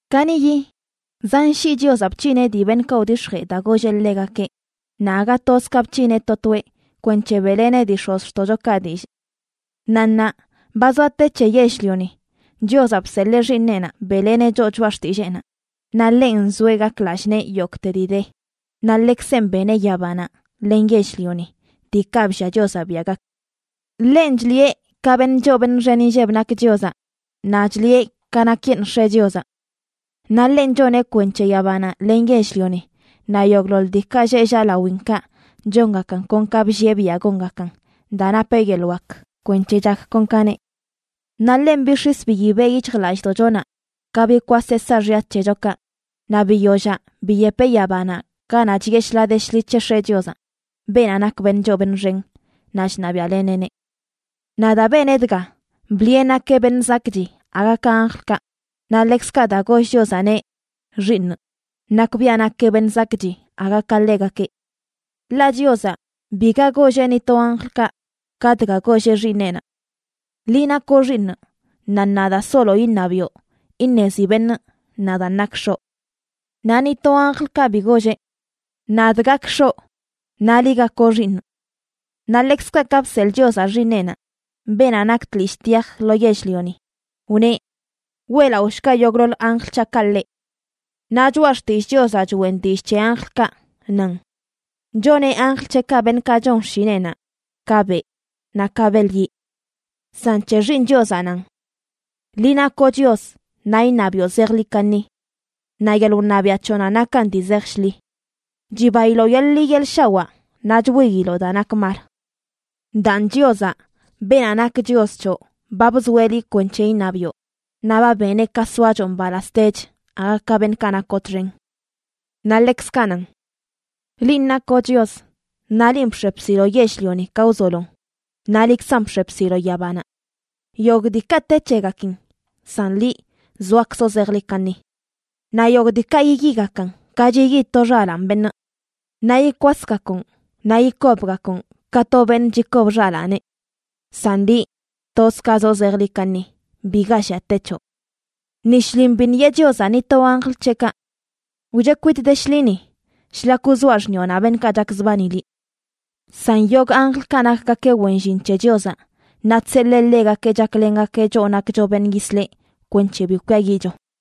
Kaniꞌyi zan shii Chiozaꞌ bc̱hineꞌ dii beṉꞌkaꞌ wdix̱jee daa golleꞌ ḻegakeꞌ naꞌ aga toz ka bc̱hineꞌ to toeꞌ kwenc̱he beꞌleneꞌ dii x̱ozxtoꞌchokaꞌ dillꞌ. Naꞌ ṉaa ba zoa te c̱he yell-lioni, Chiozaꞌ bseḻee Xiiṉeꞌnaꞌ beꞌleneꞌ choꞌ choꞌa xtilleenaꞌ, naꞌ ḻenꞌ nzoeꞌ gak lallꞌ nee yogꞌte dii de, naꞌ ḻekzenꞌ beneꞌ yabanaꞌ len yell-lioni, diikaꞌ bllia Chiozaꞌ biaꞌ gak. Ḻenꞌ chliꞌe ka beṉꞌ choo beṉꞌ xen inlleb nak Chiozaꞌ, naꞌ chliꞌe ka nakyeṉꞌ X̱eꞌ Chiozaꞌ. Naꞌ ḻenꞌ choneꞌ kwenc̱he yabanaꞌ len yell-lioni naꞌ yogꞌḻoḻ diikaꞌ lleꞌ llaꞌ lawinkaꞌ chongakan kon ka bllieꞌ biaꞌ gongakan daa napeꞌ yeḻꞌ wak kwenc̱he chak kon ka neꞌ. Naꞌ ḻenꞌ bix̱is biyibeꞌ yic̱hjlallꞌdoꞌchonaꞌ ka bikwaseꞌ saaxya c̱hechokaꞌ, naꞌ biyollaꞌ biyepeꞌ yabanaꞌ ganaꞌ chiꞌe shḻaa de shḻi c̱he X̱eꞌ Chiozaꞌ, beenaꞌ nak beṉꞌ choo beṉꞌ xen, naꞌ chṉabiaꞌleneꞌneꞌ. Naꞌ daa beneꞌ dga, bliꞌe nakeꞌ beṉꞌ zakꞌchi aga ka anjlkaꞌ, naꞌ ḻekzkaꞌ daa goll Chiozaꞌneꞌ “Xiiṉꞌ”, nakbiaꞌ nakeꞌ beṉꞌ zakꞌchi aga ka ḻegakeꞌ. Ḻaꞌ Chiozaꞌ biga golleꞌ ni to anjlkaꞌ ka dga golleꞌ Xiiṉeꞌnaꞌ: Liꞌ nakoꞌ Xiiṉꞌ, naꞌ ṉaa daa solo iṉabiꞌo iṉezi beṉꞌ nadaan nakꞌ X̱oꞌ. Naꞌ ni to anjlkaꞌ bi golleꞌ: Nadꞌ gakꞌ X̱oꞌ, naꞌ liꞌ gakoꞌ Xiiṉꞌ. Naꞌ ḻekzkaꞌ ka bseḻꞌ Chiozaꞌ Xiiṉeꞌnaꞌ, beenaꞌ nak tlishꞌ tyaj, lo yell-lioni, wneꞌ: Weꞌlaꞌoshga yogꞌḻoḻ anjl c̱haꞌkaꞌ ḻeꞌ. Naꞌ Choꞌa Xtillꞌ Chiozaꞌ choꞌen dillꞌ c̱he anjlkaꞌ, nan: Choneꞌ anjl c̱heꞌkaꞌ beṉꞌkaꞌ chon xshineꞌnaꞌ, ka beꞌ naꞌ ka beḻ yiꞌ. San c̱he Xiiṉ Chiozaꞌ nan: Liꞌ nakoꞌ Chios naꞌ iṉabiꞌo zejḻi kaṉi. Naꞌ yeḻꞌ wṉabiaꞌ c̱hoꞌnaꞌ nakan dii zej shḻi. Chibailoꞌ yeḻꞌ ḻi yeḻꞌ shawaa naꞌ chwiiloꞌ daa nak mal. Daan Chiozaꞌ, beenaꞌ nak Chios c̱hoꞌ, ba bzoeꞌ liꞌ kwenc̱he iṉabiꞌo, naꞌ ba beneꞌ ka soachoꞌ mbalaztech aga ka beṉꞌkaꞌ nakoꞌ txen. Naꞌ ḻekzkaꞌ nan: Linꞌ nakoꞌ Chios, naꞌ linꞌ bx̱e bsiloꞌ yell-lioni ka wzolon, naꞌ liꞌkzan bx̱e bsiloꞌ yabanaꞌ. Yogꞌ diikaꞌ te c̱hegakin, san liꞌ zoakzoꞌ zejḻi kaṉi. Naꞌ yogꞌ diikaꞌ yiyigakan ka chiyi to xalaan beṉꞌ. Naꞌ yikwasgakoꞌn, naꞌ yikobgakoꞌn ka to beṉꞌ chikob xalaaneꞌ. San liꞌ, toz ka zoꞌ zejḻi kaṉi; biga llia te c̱hoꞌ. Ni shlin biṉꞌ yeꞌ Chiozaꞌ ni to anjl c̱heꞌkaꞌ: Wcheꞌ kwitꞌ de shḻi ni, shlak wzoaꞌ xṉiꞌonaꞌ beṉꞌkaꞌ chakzbani liꞌ. San yogꞌ anjlkaꞌ nakgakeꞌ wen llin c̱he Chiozaꞌ, naꞌ chseḻee ḻegakeꞌ chaklengakeꞌ choꞌ nakcho beṉꞌ yisleꞌ kwenc̱he bi kwiayiꞌcho.